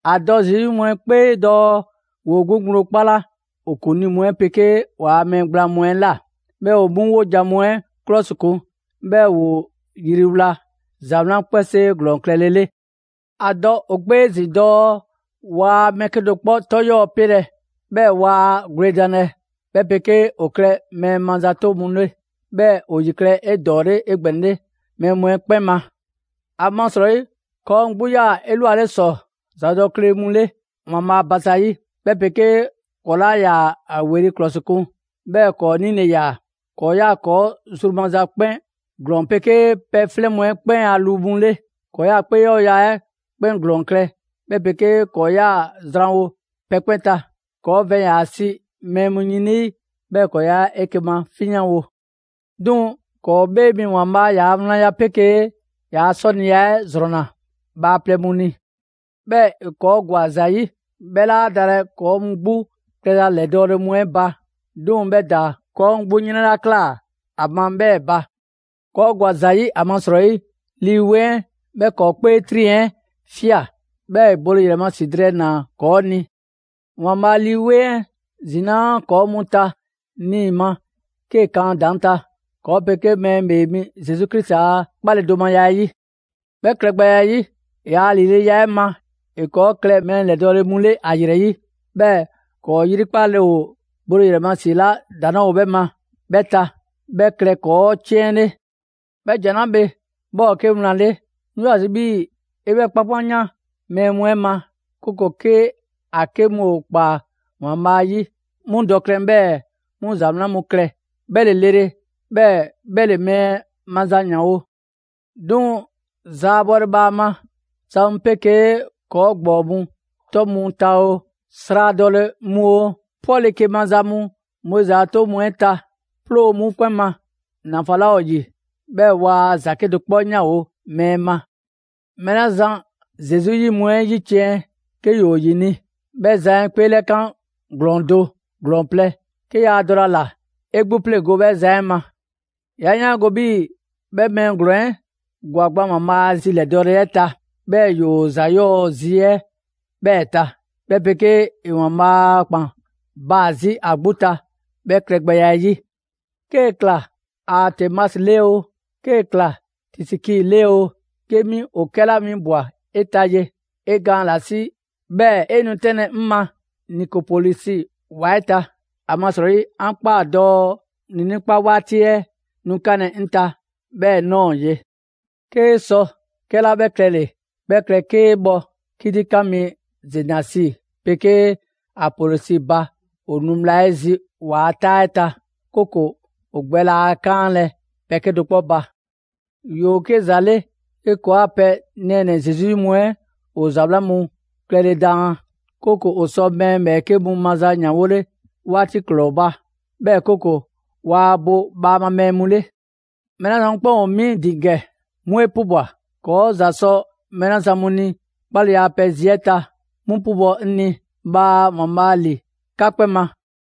‑A dɔ Zesu 'yi mu 'ɛ 'kpee dɔɔ ‑woo 'gbu ŋgblo 'kpala ‑o ‑kuŋlii mu 'ɛ 'pegee ‑waa mɛɛ gblaan mu 'ɛ ꞊la. 'Bhɛɛ‑ ‑o 'mu 'wojan‑ mu 'ɛ 'klɔsikun, 'bhɛɛ‑ ‑woo yriwla ‑za 'wlan 'kpɛnsee ‑glɔɔn klɛle 'le. ‑A dɔ ‑o 'kpee 'ezin‑ dɔɔ waa mɛɛ 'kedo‑ 'kpɔ 'tɔ 'yɔɔ‑ pelɛ, 'bhɛɛ‑ waa gwledanlɛ, 'bhɛ 'pegee ‑o klɛ mɛɛ mazato mu 'le; 'bhɛɛ‑ ‑o ‑yi klɛ 'edɔɔle 'egbɛnɛle mɛɛ mu 'ɛ 'kpɛn ma. ‑Amasrɔyi ‑kɔɔ' mu 'gbu 'yaa‑ 'elwale ‑sɔ ‑zadɔkle mu 'le ‑Waanbhaa' ba zayi', 'bhɛ 'pegee ‑kɔɔ' 'laa ‑yaa ‑a ‑weli' ‑klɔsikun, 'bhɛɛ‑ ‑kɔɔ' 'nile‑ ‑yaa. ‑Kɔɔ' 'yaa‑ ‑kɔɔ' zru maza 'kpɛn ‑glɔɔn 'pegee pɛ 'flɛn mu 'ɛ 'kpɛn a lu mu 'le. ‑Kɔɔ' 'yaa‑ 'kpee 'yɔɔya‑ 'ɛ 'kpɛn ‑glɔɔn klɛ, 'bhɛ 'pegee ‑kɔɔ' 'yaa‑ zranwo pɛ 'kpɛn ta. ‑Kɔɔ' vɛn ‑yaa si mɛɛ mu yin ‑lii, 'bhɛɛ‑ ‑kɔɔ' 'yaa‑ 'eke‑ mafinyanwo. 'Duŋ‑ ‑kɔɔ' 'Bhee ‑Waanbhaa' ‑yaa' wlanya 'pegee ‑yaa' 'sɔniya 'ɛ ‑zrɔnna bhaaplɛŋ mu ni. 'Bhɛɛ‑ ‑e ‑kɔɔ' ‑gwa ‑za 'yi; 'bhɛ 'laa dalɛ ‑kɔɔ' mu 'gbu klɛza ‑lɛdɔɔle mu 'ɛ ba, 'duŋ‑ 'bhɛ ‑daa ‑kɔɔ' mu 'gbu 'yrɛn 'la ꞊klaa ‑a ma 'bhɛɛ‑ ba. ‑Kɔɔ' ‑gwa ‑za ‑yi ‑amasrɔyi, Lii 'Weŋ 'ɛ, 'bhɛ ‑kɔɔ' 'kpee 'triŋ‑ 'ɛ ꞊fia, 'bhɛɛ‑ ‑e bole ‑yrɛ ma ‑si drɛɛ ‑naa ‑kɔɔ' ni. ‑Waanbhaa' Lii 'Weŋ 'ɛ ‑zinaa' ‑kɔɔ' mu ta niima 'kee‑ kan ‑a ‑daŋ' ta, ‑kɔɔ' 'pegee mɛɛ 'Bhee mi Zesu Krisi a 'kpaledomaya 'ɛ 'yi. 'Bhɛ klɛgbɛya 'ɛ 'yi, ‑yaa' ‑lileya 'ɛ ma, ‑e ‑kɔɔ' klɛ mɛɛ ‑lɛdɔɔle mu 'le ‑a ‑yrɛ 'yi, 'bhɛɛ‑ ‑kɔɔ' 'yrikpale ‑o bole ‑yrɛ ma ‑si 'la ‑daŋ' 'laa ‑o 'bhɛ ma 'bhɛ ta, 'bhɛ klɛ ‑kɔɔ' 'ciɛn 'le. 'Bhɛ ‑jan 'la bhe, 'bhɛ ‑o 'ke wlan 'le. 'Ŋ 'yoo‑ ‑a zi' 'bhii‑ 'e 'bhɛ 'kpankpanyan mɛɛ mu 'ɛ ma, 'kooko‑ 'ke ‑a 'ke mu ‑o ꞊kpaa ‑Waanbhaa' 'yi, 'mu dɔ klɛn 'bhɛɛ‑ 'mu za 'wlan mu klɛ. 'Bhɛ ‑le lele, 'bhɛɛ‑ 'bhɛ ‑le mɛɛ maza ‑yanwo'. 'Duŋ‑ zaabɔle bhaama za mu 'pegee ‑kɔɔ' ‑gbɔɔ mu 'tɔ mu ta oo, sradɔle mu oo, 'pɔke‑ maza mu Moizi a 'toŋ mu 'ɛ ta, 'ploo 'mu 'kpɛn ma. ‑Nafan 'laa ‑o ‑yi, 'bhɛɛ‑ waa ‑za 'kedo‑ 'kpɔ 'yanwo‑ mɛɛ ma. Mɛɛ 'la zan Zesu 'yi mu 'ɛ ‑yiciɛn' 'ke ‑yoo ‑yini', 'bhɛ zan 'ɛ 'kpeelɛkan ‑glɔɔn do, ‑glɔɔn plɛ. 'Ke yaa dɔlɛ ‑a ‑la, 'e 'gbu 'e 'pleŋgo‑ 'bhɛ zan 'ɛ ma. 'Ya 'yaango‑ 'bhii‑ 'bhɛ mɛɛ ‑glɔɔn 'ɛ ‑gwa gban ‑Waanbhaa' a zi ‑lɛdɔɔle 'ɛ ta, 'bhɛɛ‑ ‑yoo ‑za 'yɔɔ‑ zi 'ɛ 'bhɛɛ‑ ta, 'bhɛ 'pegee ‑e ‑Waanbhaa' a ‑kpan baa‑ 'zi ‑a 'gbu ta 'bhɛ klɛgbɛya 'ɛ 'yi. 'Kee‑ ꞊kla Aatemasi 'le oo, 'kee‑ ꞊kla Tisiki 'le oo, 'ke 'mi ‑o 'kɛla 'winbwa‑ 'e ta ye, 'e gaan ‑la 'si 'bhɛɛ‑ 'e nu 'tɛnlɛ‑ 'ŋ ma Nikopolisi ‑wa 'ɛ ta; ‑amasrɔyi 'an ꞊kpaa dɔɔ ‑niinii' 'kpa 'waati 'ɛ nu 'kanlɛ‑ 'ŋ ta 'bhɛɛ‑ ꞊nɔɔ ye. 'Kee sɔ 'kɛla 'bhɛ klɛle‑, 'bhɛ klɛ 'kee bhɔ 'kitikan mi Zenasi 'pegee Apolɔsi ba ‑o nu bhla 'ɛ zi ‑waa' 'taa 'ɛ ta, 'kooko‑ ‑o gbɛ laa 'kaanlɛ‑ pɛ 'kedo‑ 'kpɔ ba. ‑Yoo 'ke ‑za 'le 'ke ‑kɔɔa' pɛ nɛɛnɛ‑ Zesu 'yi mu 'ɛ ‑o ‑za 'wlan mu klɛle daan, 'kooko‑ ‑o sɔ mɛɛ ‑bhɛɛke' mu maza ‑yanwole 'waati ‑glɔɔ ba, 'bhɛɛ‑ 'kooko‑ waa bo bhaama mɛɛ mu 'le. Mɛɛ 'la zan mu 'kpɛn ‑o 'mi ‑din ‑gɛ, 'mu 'e 'pubwa‑. ‑Kɔɔ' ‑za sɔ mɛɛ 'la zan mu ni 'kpaleya a pɛ zi 'ɛ ta, 'mu 'pubɔ‑ 'ŋ ni. Bhaa ‑Waanbhaa' ‑li 'ka 'kpɛn ma!